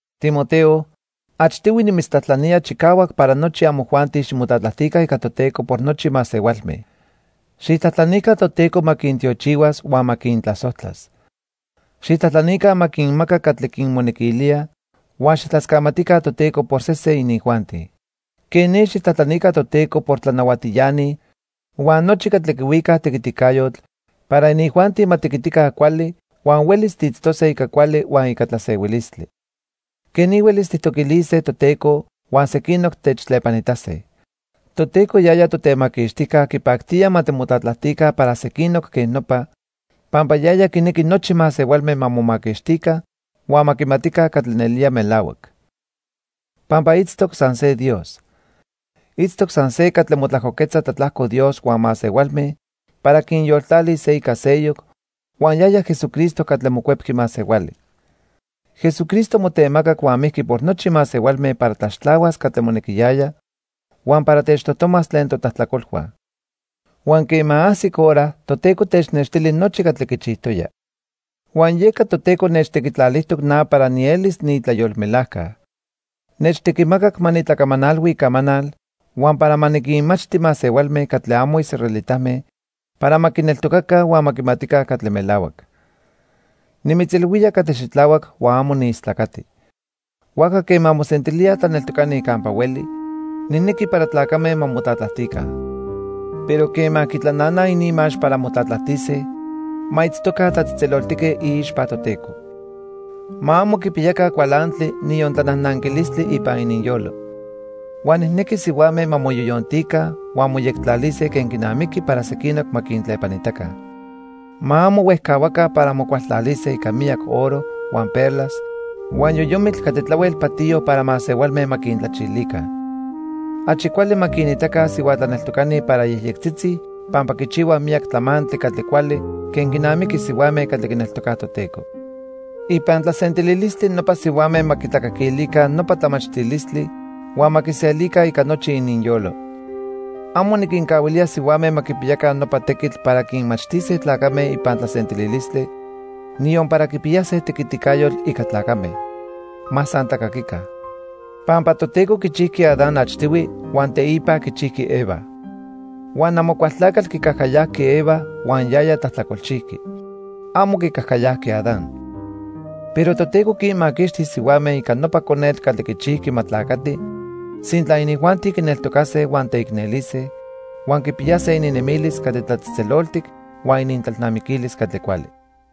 Timoteo, achtihui nimitztlajtlanía chicahuac para nochi amojuanti ximotlatlajtica ica Toteco por nochi masehualme. Xijtlajtlanica Toteco ma quintiochihuas huan ma quintlasojtlas. Xijtlajtlanica ma quinmaca catli quinmonequilía huan xijtlascamatica Toteco por sesen inijuanti. Quej ni xijtlajtlanica Toteco por tlanahuatiani huan nochi catli quihuicaj tequiticayotl para inijuanti ma tequitica cuali huan huelis tiitztose ica cuali huan ica tlasehuilistli. Quej ni huelis tijtoquilise Toteco huan sequinoc techtlepanitase. Toteco yaya Totemaquixtijca quipactía ma timotlatlajtica para sequinoc quej nopa, pampa yaya quinequi nochi masehualme ma momaquixtica huan ma quimatica catli nelía melahuac. Pampa itztoc san se Dios. Itztoc san se catli motlajcoquetza tlatlajco Dios huan masehualme para quinyoltlalis se ica seyoc, huan yaya Jesucristo catli mocuepqui masehuali. Jesucristo motemacac huan mijqui por nochi masehualme para tlaxtlahuas catli monequiyaya huan para techtojtomas tlen totlajtlacolhua. Huan quema ajsic hora Toteco technextili nochi catli quichijtoya. Huan yeca Toteco nechtequitlalijtoc na para nielis niitlayolmelajca. Nechtequimacac ma nitlacamanalhui icamanal huan para ma niquinmachti masehualme catli amo israelitame para ma quineltocaca huan ma quimatica catli melahuac. Nimitzilhuía catli xitlahuac huan amo niistlacati. Huajca quema mosentilíaj tlaneltocani campa hueli, nijnequi para tlacame ma motlatlajtica. Pero quema quitlananaj ininmax para motlatlajtise ma itztoca tlatzejtzeloltique iixpa Toteco. Ma amo quipiyaca cualantli niyon tlanajnanquilistli ipan ininyolo. Huan nijnequi sihuame ma moyoyontica huan moyectlalise quen quinamiqui para sequinoc ma quintlepanitaca. Ma amo huejcahuaca para mocualtlalise ica miyac oro, huan perlas, huan yoyomitl catli tlahuel patiyo para masehualme ma quintlachilica. Achi cuali ma quinitaca sihua tlaneltocani para yejyectzitzi pampa quichihuaj miyac tlamantli catli cuali quen quinamiqui sihuame catli quineltocaj Toteco. Ipan tlasentililistli nopa sihuame ma quitlacaquilica nopa tlamachtilistli huan ma quiselica ica nochi ininyolo. Amo niquincahuilía sihuame ma quipiyaca nopa tequitl para quinmachtise tlacame ipan tlasentililistli, niyon para quipiyase tequiticayotl ica tlacame. Ma san tlacaquica. Pampa Toteco quichijqui Adán achtihui huan teipa quichijqui Eva. Huan Amocualtlacatl quicajcayajqui Eva huan yaya tlajtlacolchijqui. Amo quicajcayajqui Adán. Pero Toteco quinmaquixtis sihuame ica nopa conetl catli quichijqui ma tlacati sintla inijuanti quineltocase huan teicnelise huan quipiyase ininnemilis catli tlatzejtzeloltic huan inintlalnamiquilis catli cuali.